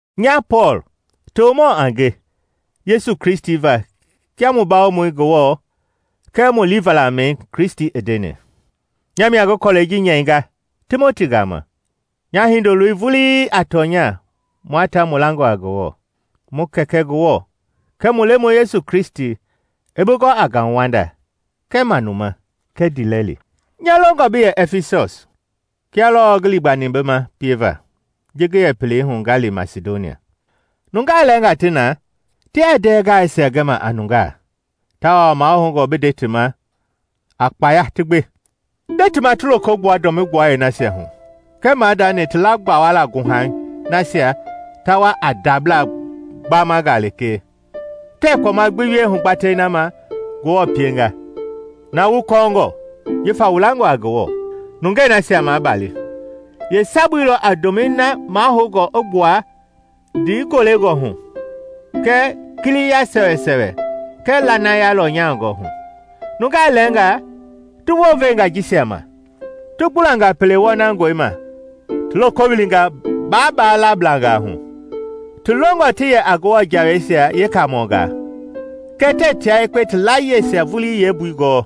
Nya Pɔɔl, tomɔ a nge Yesu Kristi va kia mu Bawomɔi Ngewɔ kɛɛ mu liivalamɛi Kristi i ndeni. Nya mia ngi kɔlɛi ji nyɛinga Timoti gama, nya hindoloi vulii a tɔnya mua ta mu langɔ a Ngewɔ. Mu Kɛkɛ Ngewɔ kɛɛ mu Lemɔi Yesu Kristi i bi gɔ a ngauwanda kɛɛ manuma kɛɛ ndiilɛli. Nya longɔ bi yɛ Ɛfisɔs, kia lɔɔ ngi liigbani bi ma pieva ji ngi yɛ pelei hu nga li Masidonia. Nungaa lɛɛngaa ti na tiaa ndɛɛ gaaisia gɛma a nungaa, tawao mahoungɔ bi nde ti ma a kpaya ti gbe. Nde ti ma ti loko gbua dɔmi gbualei nasia hu kɛɛ maadani ti laa gbawala guhaguhai nasia ta wa a ndabla gbamanga lekee; tɛɛ kpɔma gbi wie hugbatɛi na ma Ngewɔ pienga, na wu kɔɔngɔ jifa wu langɔ a Ngewɔ. Nungɛi nasia mabalila yeesabui lɔ a ndomɛi na mahoungɔ i gbua ndiigolengɔ hu, kɛɛ kiliya sɛwɛsɛwɛ, kɛɛ lanaya lɔnyangɔ hu. Nungaa lɛɛnga ti wounvenga jisia ma, ti gbulanga pele wɔnangɔi ma ti loko wilinga baaba lablangaa hu. Ti longɔ ti yɛ a Ngewɔ jawei yeekamɔnga, kɛɛ tɛɛ tia yekpe ti layieisia vulii yeembui gɔɔ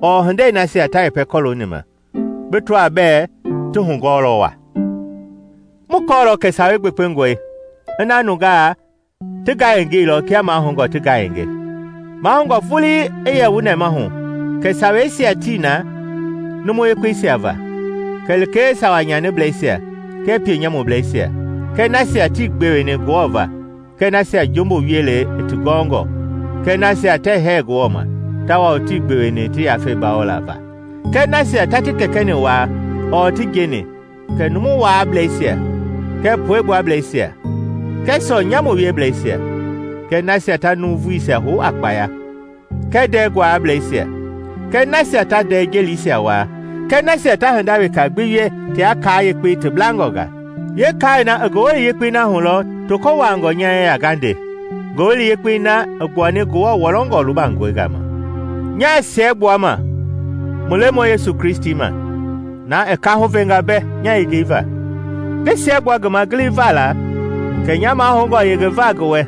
ɔɔ hindei nasia ta yɛpɛ kɔlooni ma bi tɔa bɛɛ ti hugɔɔlɔ wa. Mu kɔɔlɔ kɛ Sawei gbekpengɔe ina nungaa ti ngayengeilɔ kia mahoungɔ ti ngayenge. Mahoungɔ vulii i yɛ wu nɛmahu kɛ Saweisia tii na numu yekpeisia va, kɛlee sawa nyaniblɛisia kɛɛ pienyamubleisia kɛɛ nasia tii gbeweni Ngewɔ va kɛɛ nasia jumbu wielei i ti gɔɔngɔ kɛɛ nasia tɛɛ hɛɛ Ngewɔ ma tawao tii gbeweni ti yafei bawola va kɛɛ nasia ta ti kɛkɛ-ni waa ɔɔ ti njeni kɛɛ numu waableisia, kɛɛ puegbuableisia, kɛɛ sɔɔ-nyamu wieblɛisia kɛɛ nasia ta nuuvuisia hou a kpaya kɛɛ ndɛɛ guaalablɛisia kɛɛ nasia ta ndɛɛ jelisia wuaa kɛɛ nasia ta hinda weka gbi wie tia kaa yekpei ti blangɔ nga. Yeekaai na i Ngowili Yekpei na hu lɔ toko wuaangɔ nya yeya nga nde, Ngowili Yekpei na i gbuani Ngewɔ wɔlɔngɔ lubangɔi gama. Nyaa siɛgbuama mu Lemɔi Yesu Kristi ma, na i kaahu venga mbɛ nya yengei va. Ngi siɛgbua ngi ma giliva la kɛ nya mahoungɔ yengeva ngi wɛ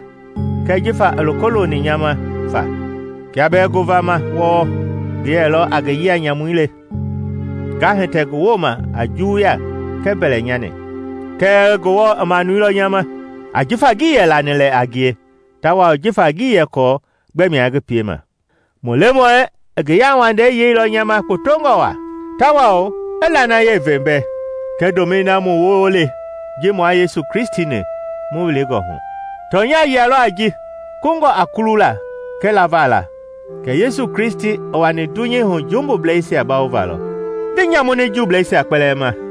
kɛɛ jifa i loko loni nya ma fa, kia bɛɛ ngovama wɔɔ ngi yɛlɔ a ngi yia-nyamu le, nga hitɛ ngi wooma a juwuya kɛɛ mbɛlɛnyani. Kɛɛ Ngewɔ i manuilɔ nya ma, ajifa ngii yɛ lani lɛ a ngie tawao jifa ngii yɛ kɔɔ gbɛmia ngi piema. Mu Lemɔi i ngi yauwandei yeilɔ nya ma kpotongɔ waa, tawao i lanayei ve mbɛ kɛɛ ndomɛi na mu woo le ji mua Yesu Kristi-ni mu wilingɔ hu. Tɔnya yia lɔ a ji, kungɔ a kulula kɛɛ lava la kɛ Yesu Kristi i wani dunyei hu jumbubleisia bawova lɔ. Ngi nyamuni jumbubleisia kpɛlɛɛ ma,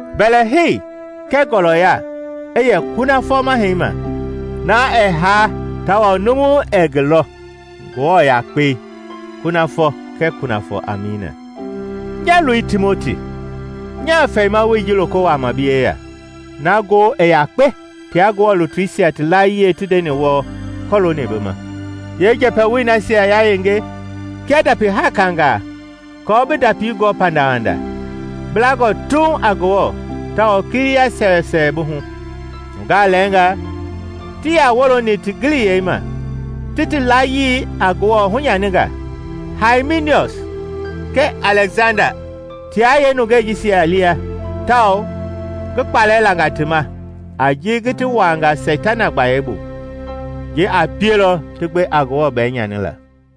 Mbɛlɛhei kɛɛ ngɔɔlɔya i yɛ kunafɔ Mahɛi ma, na ɛɛ haa tawao numu ɛɛ ngi lɔ, Ngewɔ Yakpei, kunafɔ kɛɛ kunafɔ! Amiina. Nya loi Timoti, nyaa fɛimawoi ji loko wuama bi yeya, na ngoo i yakpe tia Ngewɔ lutuisia ti layie ti ndeni wɔɔ kɔlooni bi ma. Yee njɛpɛwoi nasia yayenge kia ndapi hakangaa aako bi ndapi gɔ pandawanda, bi langɔ tuuŋ a Ngewɔ tawao kiliya sɛwɛsɛwɛ bi hu. Nungaa lɛɛnga tii yaa wooloni ti giliyei ma, ti ti layii a Ngewɔ hunyaninga. Haiminiɔs kɛɛ Alɛksanda tia yeenungɛi jisia lia tawao ngi kpalɛ langa ti ma a ji ngi ti wuanga Seitana gbayei bu; ji a pielɔ ti gbe a Ngewɔ bɛɛnyanila.